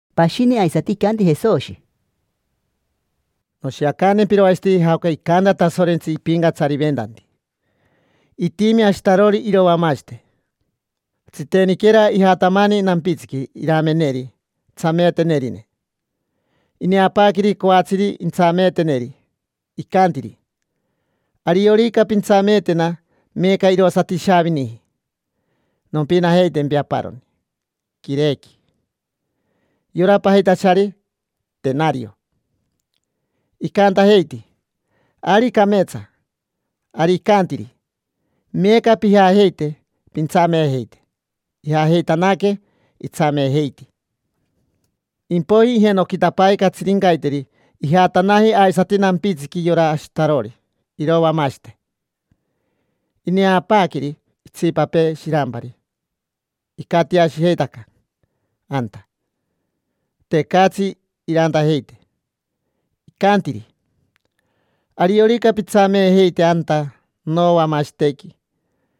Pashini aisati icanti Jesoshi: —Noshiacantempiro aisati jaoca icanta Tasorentsi ipincatsariventanti. Itimi ashitarori irovamashite. Tsiteniquera ijatamani nampitsiqui irameneri tsameetenerine. Ineapaaqueri coatsiri intsameeteneri, icantiri: “Ariorica pintsameetena meeca, irosati ishaaviniji, nompinajeitempi aparoni quirequi: yora pajitachari tenario”. Icantajeiti: “Ari cameetsa”. Ari icantiri: “Meeca pijajeite, pintsameejeite”. Ijajeitanaque, itsameejeiti. Impoiji ijenoquitapaaque catsirincaiteri, ijatanaji aisati nampitsiqui yora ashitarori irovamashite. Ineapaaqueri itsipapee shirampari, icatiashijeitaca anta, tecatsi irantajeite. Icantiri: “Ariorica pintsameejeite anta novamashitequi,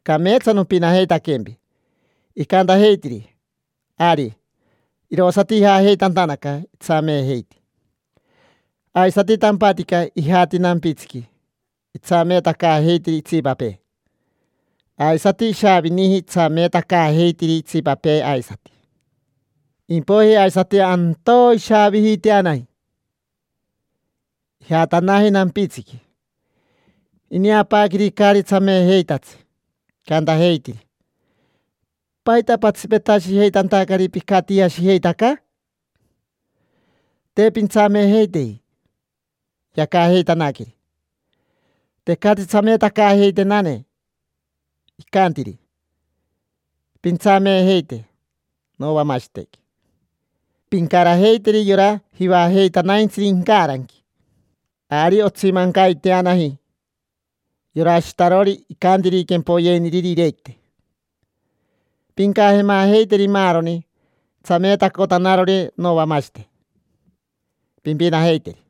cameetsa nompinajeitaquempi”. Icantajeitiri: “Ari”. Irosati ijajeitantanaca, itsameejeiti. Aisati tampatica ijati nampitsiqui, itsameetacaajeitiri itsipapee. Aisati ishaavijini itsameetacaajeitiri itsipapee aisati. Impoiji aisati antoo ishaavijiteanaji, ijatanaji nampitsiqui. Ineapaaqueri caari tsameejeitatsi. Icantajeitiri: “¿Paita patsipetashijeitantari picatiashijeitaca? Te pintsameejeiteji”. Yacajeitanaqueri: “Tecatsi tsameetacaajeitenane”. Icantiri: “Pintsameejeite novamashitequi, pincarajeiteri yora jivajeitanaintsiri incaranqui”. Ari otsimancaiteanaji, yora ashitarori icantiri quempoyeiniriri iirequite: “Pincajemajeiteri maaroni tsameetacotanarori novamashite, pimpinajeiteri.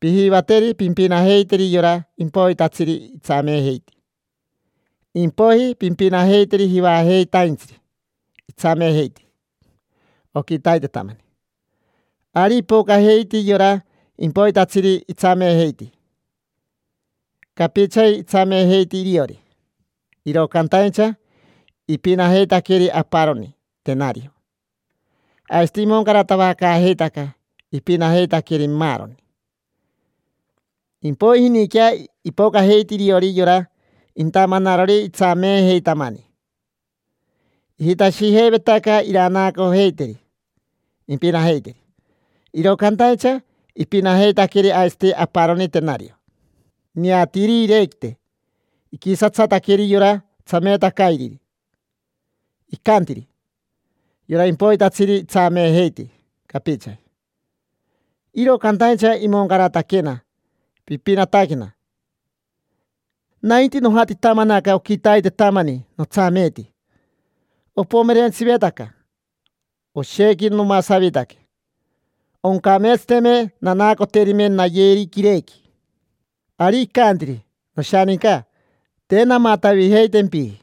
Pijivateri pimpinajeiteri yora impoitatsiri itsameejeiti. Impoiji pimpinajeiteri jivajeitatsiri itsameejeiti oquitaitetamani”. Ari ipocajeiti yora impoitatsiri itsameejeiti: capichaji itsameejeiti iriori, iro cantaincha ipinajeitaqueri aparoni tenario. Aisati imoncaratavacaajeitaca ipinajeitaqueri maaroni. Impoijiniquea ipocajeiti iriori yora intamanarori itsameejeitamani. Ijitashijeivetaca iranaacojeiteri impinajeiteri. Iro cantaincha ipinajeitaqueri aisati aparoni tenario. Ineatiiri iirequite, iquisatsataqueri yora tsameetacairiri, icantiri: “Yora impoitatsiri itsameejeiti capichaji, iro cantaincha imoncarataquena pipinataquena. Nainti nojatitamanaca oquitaitamani notsameeti, opomerentsivetaca, oshequi nomasavitaque. Oncameetsateme nanaacoterime nayeri quirequi”. Ari icantiri: “Noshaninca, te namatavijeitempiji.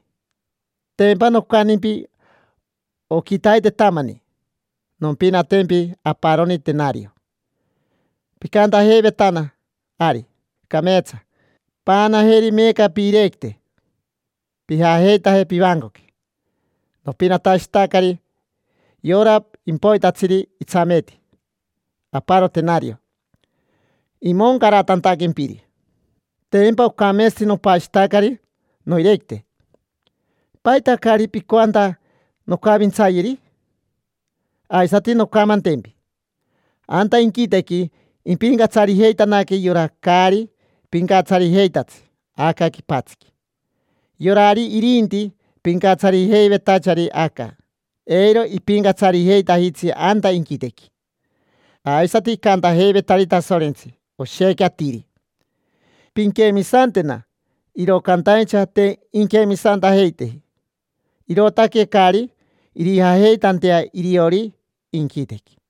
Tempa nocantimpi oquitaitetamani: ‘Nompinatempi aparoni tenario’; picantajeivetana: ‘Ari, cameetsa’. Paanajeri meeca piirequite, pijajeitaje pivancoqui. Nopinatashitacari yora impoitatsiri itsameeti aparo tenario imoncaratantaquempiri. Tempa ocameetsati nopashitacari noirequite. ¿Paita caari picoanta noncavintsayeri?” Aisati noncamantempi: anta inquitequi impincatsarijeitanaque yora caari pincatsarijeitatsi aca quipatsiqui. Yorari irinti pincatsarijeivetachari aca, eiro ipincatsarijeitajitsi anta inquitequi. Aisati icantajeivetari Tasorentsi oshequi atiri: “Pinquemisantena”, iro cantaincha te inquemisantajeiteji, irootaque caari irijajeitantea iriori inquitequi.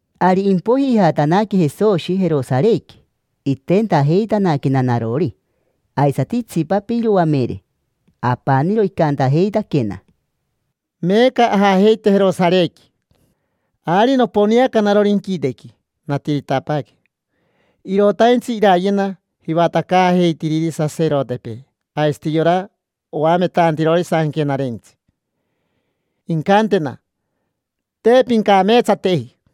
Ari impoiji ijatanaque Jesoshi Jerosarequi, itentajeitanaquena narori, aisati itsipapee iroamere. Apaniro icantajeitaquena: —Meeca ajajeite Jerosarequi. Ari noponeanaca narori inquitequi, natiritapaaque. Irotaintsi irayena jivatacaajeitiriri saserotepee aisati yora oametantirori Sanquenarentsi, incantena: “Te pincameetsateji”.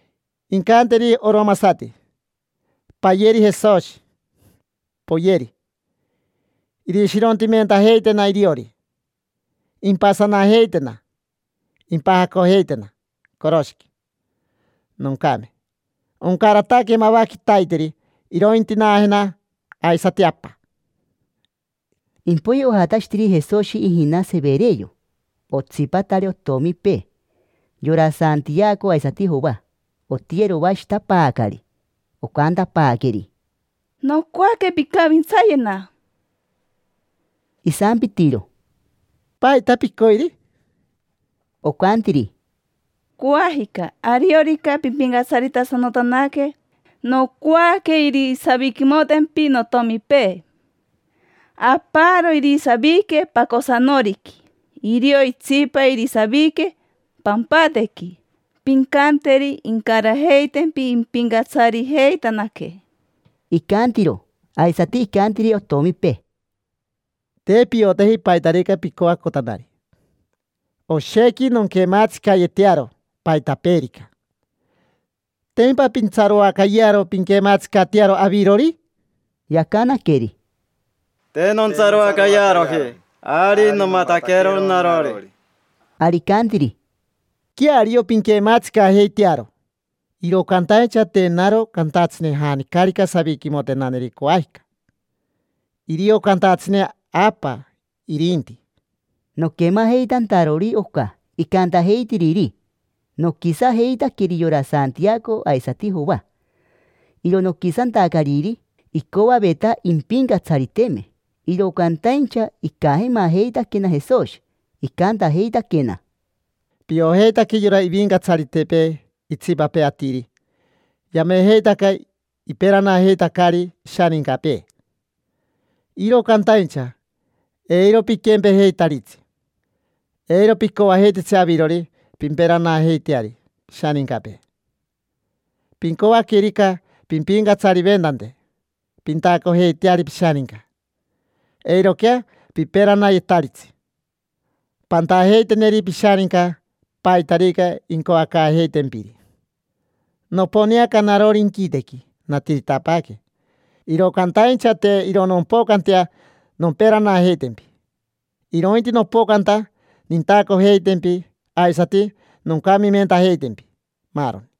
Incanteri oromasati: “Payeri Jesoshi, poyeri”. Irishirontimentajeitena iriori, impasanajeitena, impajacojeitena coroshiqui, noncame. Oncarataque mava quitaiteri irointinaajena aisati Apa. Impoiji ojatashitiri Jesoshi ijina Severeo, otsipatari otomipee: yora Santiaco aisati Joa. Otiyeroashitapaacari, ocantapaaqueri: —Nocoaque pincavintsayena. Isampitiro: —¿Paita picoiri? Ocantiri: —Coajica, ariorica pimpincatsaritasanotanaque, nocoaque irisaviquimotempi notomipee: aparo irisavique pacosanoriqui, irio itsipa irisavique pampatequi. Pincanteri incarajeitempi impincatsarijeitanaque. Icantiro, aisati icantiri otomipee: —Te pioteji paitarica picoacotanari. Oshequi nonquematsicayetearo paitapeerica. ¿Tempa pintsaroacayearo pinquematsicatearo avirori? Yacanaqueri: —Te nontsaroacayearoji, ari nomataquero narori. Ari icantiri: —Queario pinquematsicajeitearo. Iro cantaincha te naro cantatsine janicarica saviquimotenaneri coajica: irio cantatsine Apa, irinti. Noquemajeitantarori oca icantajeitiriri, noquisajeitaqueri yora Santiaco aisati Joa; iro noquisantacariri, icoaveta impincatsariteme. Iro cantaincha icajemajeitaquena Jesoshi, icantajeitaquena: —Piojeitaque yora ivincatsaritepee itsipapee atiri yamejeitaca iperanajeitacari ishanincapee. Iro cantaincha eiro piquempejeitaritsi. Eiro picoajeititsi avirori pimperanajeiteari pishanincapee. Pincoaquerica pimpincatsariventante pintacojeiteari pishaninca, eiroquea piperanayetaritsi. Pantajeiteneri pishaninca paitarica incoacaajeitempiri. Noponeaca narori inquitequi, natiritapaaque, iro cantaincha te iro nompocantea nomperanajeitempi, irointi nopocanta nintacojeitempi aisati noncamimentajeitempi, maaroni.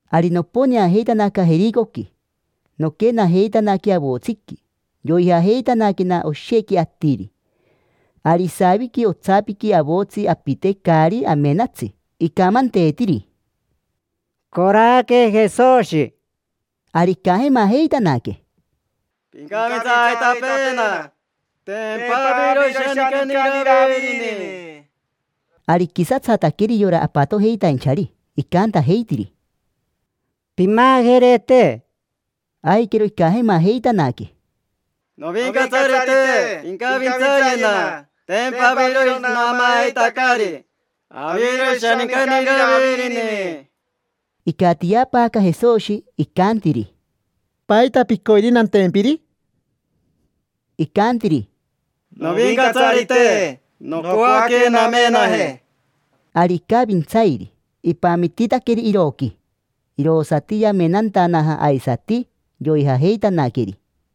Ari noponeajeitanaca Jericoqui, noquenajeitanaque avotsiqui. Yoijajeitanaquena oshequi atiri. Ari isaviqui otsapiqui avotsi apite caari amenatsi. Icamanteetiri: —Coraque Jesoshi. Ari icajemajeitanaque: —Pincavintsaajeitapeena: tempa aviro ishanincani Iravirini. Ari iquisatsataqueri yora apatojeitainchari, icantajeitiri: —Pimajerete. Aiquero icajemajeitanaque: —Novincatsarite, pincavintsayena: tempa aviro naamaajeitacari, aviro ishanincani Iravirini. Icatiapaaca Jesoshi, icantiri: —¿Paita picoiri nantempiri? Icantiri: —Novincatsarite, nocoaque namenaje. Ari icavintsairi, ipamititaqueri iroqui. Irosati yamenantanaja, aisati yoijajeitanaqueri.